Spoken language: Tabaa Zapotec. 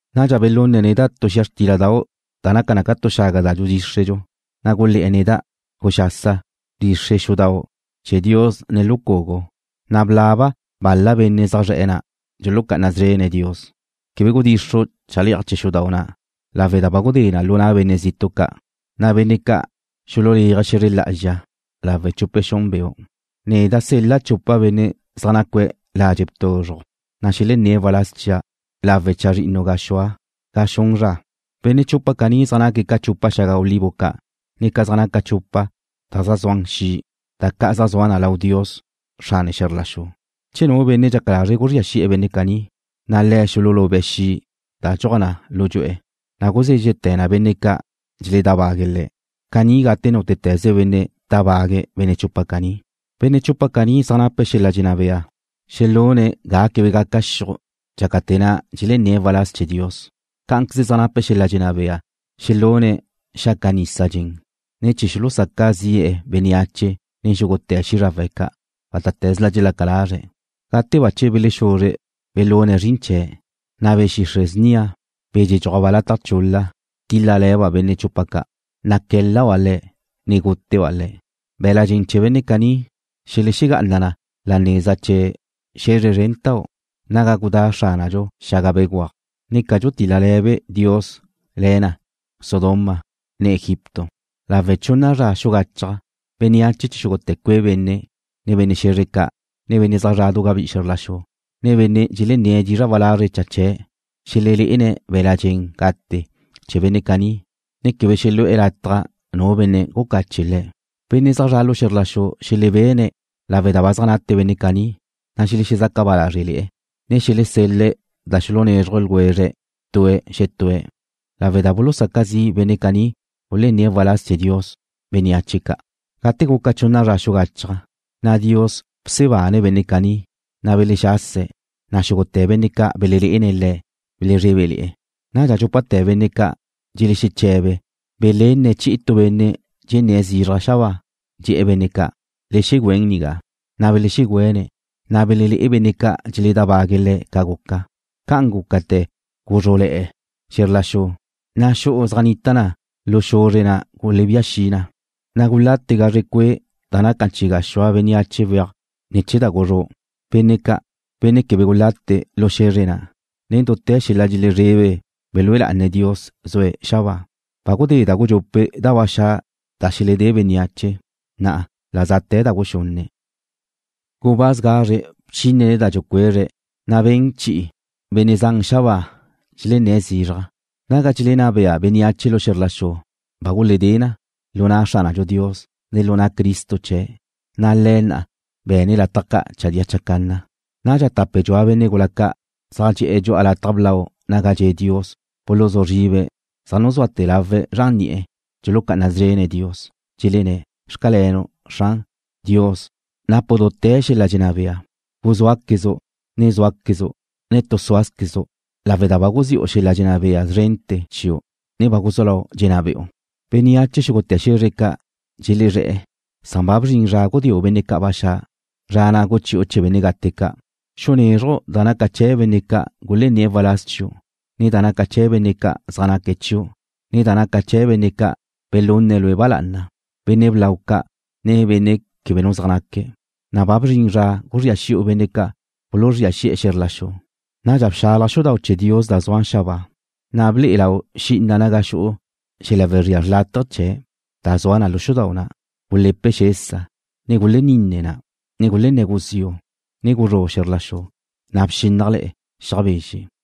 Nadxa belunne̱' neda' tu xia xtíladau' da naca na ca tu xaga da dxudxíxredxu, na' gulé̱'e̱ neda': ―Guxasa, bdxixre' xudau' chee̱ Dios ne lu cugu, na' blaba bal-la benne' zaj zre̱'e̱ na' dxulucá'ana szrene̱' Dios. Quebe gudxixru' chale'aj chee̱ xudau' na' lawe' da ba gudé na lu na' benne' zitu' ca', na' benne' ca' xululéaje̱' xe̱zre lá'azxa lawe' chupe xun beu'. Neda' sel-la' chupa benne' zaj nacue̱' ladxe' tuzruj, na' xelenné̱' waláz chia' lawe' chazrinnu gaxúa ga xun zra. Benne' chupa caní zaj naque̱' ca chupa xaga olivo ca', ne ca zaj naca chupa da zaj zuan xi', da ca' zaj zua na lau Dios, Xrane xe̱zr la xu. Che nu benne' dxaca lazre̱' guzría xi'e̱ benne' caní, na' le̱' xululube̱' xi' da dxuaj lu dxu'e̱ ca', na' guzézxete̱ na benne' ca' dxeledábague̱' le̱'. Caní gate nútete̱ze benne' tábague̱' benne' chupa caní. Benne' chupa caní zaj nape̱' xel-la' dxenná bea xelune̱' ga quebe gaca xiuj dxácate̱ na' dxelenné̱' waláz chee̱ Dios. Cá'anqueze zaj nape̱' xel-la' dxenná bea xelune̱' xaca nisa dxen, ne chee̱ xulusaca zi'e̱ bénneache nen xúgute̱ xízrawe̱' ca', bátate̱zla dxelaca lazre̱'. Gate bache belexuzre belune̱' zrin chee̱', na' be̱ xixre' snia, be̱ dxedxúajba' lataj chul-la, tíl-lale̱ba' benne' chupa ca', na' qué̱l-laba' le̱', ne gúteba' le̱'. Be̱la' dxen gate chee̱ benne' caní xelexegá'ana na la neza chee̱ xe̱zre zrentau' naga gudá' Xránadxu xaga begúaj, ne ca dxutil-la Dios le̱be, le̱ na Sodoma, ne Egipto. Lawe' chunna zra xugachaj, bénneache chee̱ xúgute̱ cue' benne', ne benne' xe̱zre ca', ne benne' zra du gabí'i xe̱zr la xu, ne benne' dxelenné̱' dizra' walazre' cha chee̱' xelelé'ene̱' be̱la' dxen gate chee̱ benne' caní, ne quebe xelu'e̱ lataj nu benne' gucache' le̱'. Benne' zaj zre̱'e̱ lu xe̱zr la xu xelebene̱' lawe' da zaj nate benne' caní, na' xelexezaca ba lázrele̱'e̱, ne xelesel-le̱' da xulunezruj ljwezre̱' tue̱' xetue̱' lawe' da bulusaca zi' benne' caní gulenné̱' waláz chee̱ Dios bénneache ca'. Gate guca chunna zra xugachaj, na' Dios bsebane̱' benne' caní, na' belexase̱', na' xúgute̱ benne' ca' belelé'ene̱' le̱' belezrébele̱'e̱. Nadxa dxúpate̱ benne' ca' dxelexeche̱be belenne̱' chi'i tu benne' dxenné̱' zizraj xabáa, dxe̱'e̱ benne' ca': ―Le xegüén nigá. Na' belexegüene̱', na' belelé'e benne' ca' dxeledábague̱' le̱' ca guca. Ca'an gúcate̱ guzrú'le̱'e̱ xe̱zr la xu, na' xu'u zaj nita na lu xe̱zre na' gulebía xi na, na' gulate gazre cue' da nacan chi gaxúa bénneache weaj ne̱ chee̱ da guzrú'. Benne' ca', benne' quebe gulate lu xe̱zre na', nen dute̱ xel-la' dxelezrebe belúe lá'ane̱' Dios zue̱' xabáa. Ba gudé da gudxupe' da ba xa' da xeledé bénneache, na' la za'te̱ da guxunne'. Gubáz gazre bchínene̱' da dxucuezre̱', na' ben chi'i benne' zan xabáa dxelenné̱' zizraj: Naga dxelenná bea bénneache lu xe̱zr la xu ba guledé na lu na' Xránadxu Dios, ne lu na' Cristo chee̱', na' Le̱' nna be'ene̱' lataj ca' chadía chacanna. Nadxa tape dxua benne' gula ca' zaj dxe'e̱ dxu'a lataj blau naga dxe' Dios buluzú zribe̱' zaj nuzuate̱ lawe̱' zran ni'e̱, dxulucá'ana szrene̱' Dios, dxelenné̱': Xcalenu', Xran. Dios, napu' dute̱ xel-la' dxenná bea. Guzúaquezu', ne zúaquezu', ne tu súazquezu', lawe' da ba guzi'u xel-la' dxenná bea zrente̱ chiu', ne ba guzú lau' dxenná be'u. Bénneache xúgute̱ xe̱zre ca' dxelezré̱'e̱ san ba bzrin zra gudéu' benne' ca' ba xa', zra na' guchi'u chee̱ benne' gate ca'. Xunézruju' da naca chee̱ benne' ca' gulenné̱' waláz chiu', ne da naca chee̱ benne' ca' zaj naque̱' chiu', ne da naca chee̱ benne' ca' belune̱' Lue' ba lá'ana, benne' blau ca', ne benne' quebe nu zaj naca. Ba bzrin zra guzría xi'u benne' ca' buluzría xi'e̱ xe̱zr la xu. Nadxa bxalaj xudau' chee̱ Dios da zua xabáa, na' ble'e lau xi'ina naga xu'u xel-la' wezría xrlátaje chee̱', da zua na lu xudau' na'. Gule̱pe xesa, ne guleninne na, ne gulenné̱ guziu', ne guzrú' xe̱zr la xu, na' bxínnajle̱'e̱ xiaj bezxe'.